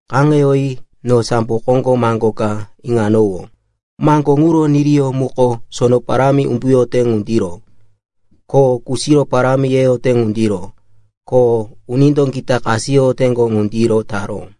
Kaŋeyoyi no sambo koŋgo maŋgo ka iŋanowó. Maŋgo ŋuro niriyó muko sono parámi umbuyote ŋundiro, ko kusiro parámi yeyote ŋundiro, ko unindo gita kasiyoteŋgo ŋundiro taró.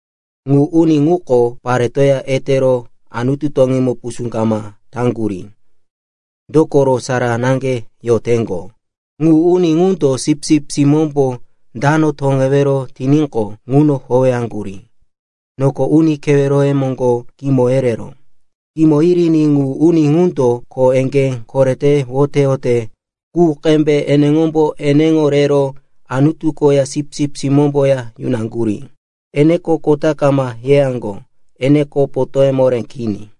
Ŋu uni ŋuko paretoya etero Anutu toŋímo pusú kama taŋgurí. Dokoro sara naŋge yoteŋgo. Ŋu uni ŋundo Sipsip Simómbo dano toŋewero tiníqo, ŋuno howeyaŋgurí. Noko uni keweroye moŋgo kimo yereró. Kimo yiriní ŋu uni ŋundo kho eŋgé korete woteyote qu qembe eneŋombo eneŋo rero Anutu koya Sipsip Simómboya yunaŋgurí. Eneko kota kama yeyaŋgo. Eneko potóye moré kini.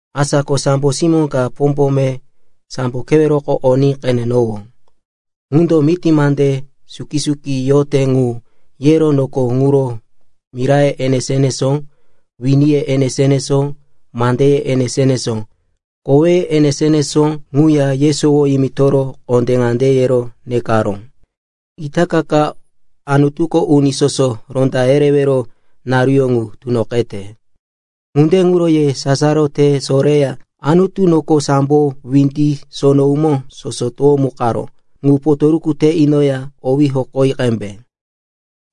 Asa ko sambo simó ka pombome sambo keweroko oní qenenowó. Ŋundo miti mande suki-suki yote ŋu yero noko ŋuro miraye enesó-enesó, winiye enesó-enesó, mandeye enesó-enesó, koweye enesó-enesó ŋu yesowo yimitoro kondé ŋande yero nekaró, “Itaka ka Anutuko uni soso ronda yerewero naruyó ŋu tunoqete. Ŋunde ŋuro ye sasaro te soreya Anutu noko sambo windi sono umó soso towomukaró ŋu potoruku te inoya owí hokoyi qembe.”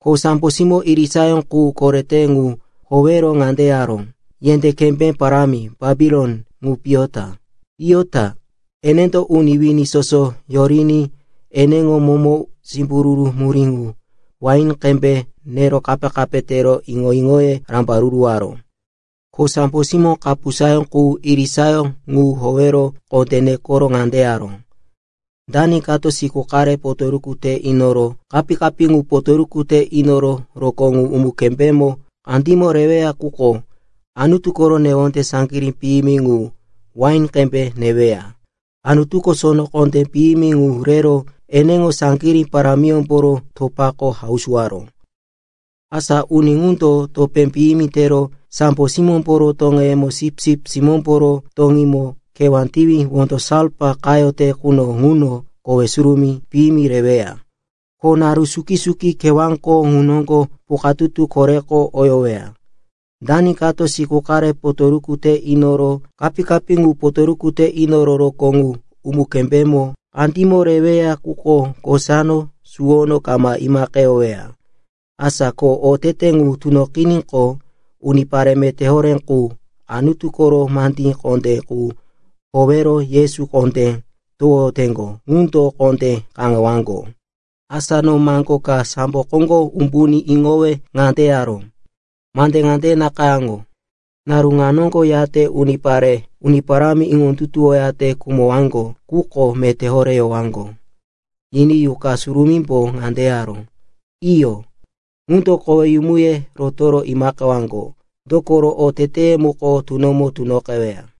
Ko sambo simó irisayó qu korete ŋu howero ŋande yaró, “Yendé kembé parámi Bapilon ŋu piyo ta, piyo ta! Enendo uni wini soso yoriní eneŋo momo simbururu murí ŋu wain qembe nero kape-kape tero iŋo-iŋoye rambaruruwaró.” Ko sambo simó kapusayó qu irisayó ŋu howero kondé nekoro ŋande yaró, “Dani kato siku qare potoruku te inoro kapí-kapí ŋu potoruku te inoro rokó ŋu umu-kembémo kandímo reweya quko Anutu koro newonde saŋgirí piyimi ŋu wain qembe neweya. Anutuko sono kondé piyimi ŋu rero eneŋo saŋgirí parámiyómboro topako hausuwaró. Asa uni ŋundo topé piyimi tero sambo simómboro toŋeyemo Sipsip Simómboro toŋímo kewá tiwi wondo salfa qayote quno ŋuno kowe surumí piyimi reweya. Ko naru suki-suki kewáko ŋu noŋgo pukatutu koreko oyoweya. Dani kato siku qare potoruku te inoro kapí-kapí ŋu potoruku te inoro rokó ŋu umu-kembémo kandímo reweya quko kosano suwono kama imaqeyoweya.” Asa ko otete ŋu tunoqiníqo, unipare meté horé qu Anutu koro mande kondé qu howero Yesu kondé towoyoteŋgo ŋundo kondé kaŋewaŋgo. Asa no maŋgo ka sambo koŋgo umbuní iŋowe ŋande yaró, “Mande ŋande nakayáŋo. Naru ŋa noŋgo yate unipare Uni Parámi iŋondutuwoyate khumowaŋgo ŋuko meté horé yowaŋgo!” Yiní Yuqa Surumímbo ŋande yaró, “Iyo, ŋundo koweyumuye rotoro imaqewaŋgo. Dokoro oteteye muko tunomo tunoqeweya.”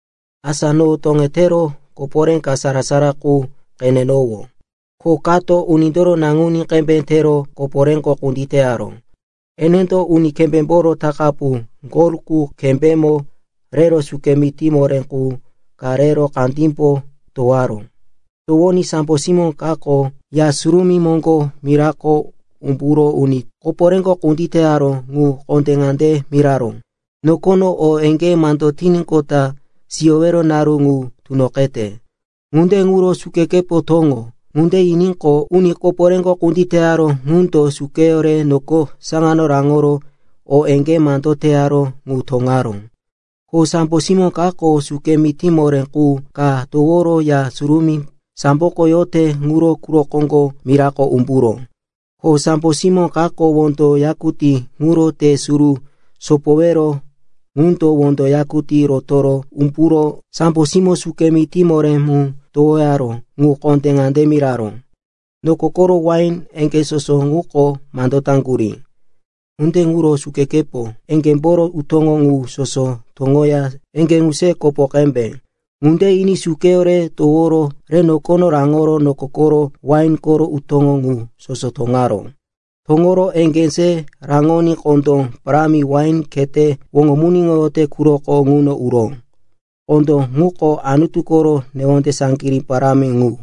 Asa no toŋetero koporé ka sara-sara qu qenenowó, ko kato unindoro naŋuní qembe tero koporéko kunditeyaró. Enendo uni kembémboro takapu gol qu kembémo rero suke mití moré qu ka re kandímbo towaró. Towoní sambo simó kako Ya Surumí moŋgo mirako umburo uni koporéko kunditeyaró ŋu kondé ŋande miraró, “Nokono o eŋgé mando tiníqota siyowero naru ŋu tunoqete. Ŋunde ŋuro sukekepo toŋo!” Ŋunde yiníqo, uni koporéko kunditeyaró ŋundo sukeyó re noko saŋano raŋoro o eŋgé mando teyaró ŋu toŋaró. Ko sambo simó kako suke mití moré qu ka toworo Ya Surumí samboko yote ŋuro quro koŋgo mirako umburó. Ko sambo simó kako wondo yakutí ŋuro te suru sopowero ŋundo wondo yakutí rotoro umburo sambo simó suke mití moré mu towoyaró ŋu kondé ŋande miraró, “Noko koro wain eŋgé soso ŋuko mando taŋgurí. Ŋunde ŋuro sukekepo eŋgémboro utóŋo ŋu soso toŋoya eŋgé ŋu se kopo qembe!” Ŋunde yiní sukeyó re toworo re nokono raŋoro noko koro wain koro utó ŋu soso toŋaró. Toŋoro eŋgé se raŋoní kondó parámi wain khete woŋomuniŋoyote quroko ŋuno uró. Kondó ŋuko Anutu koro newonde saŋgirí parámi ŋu.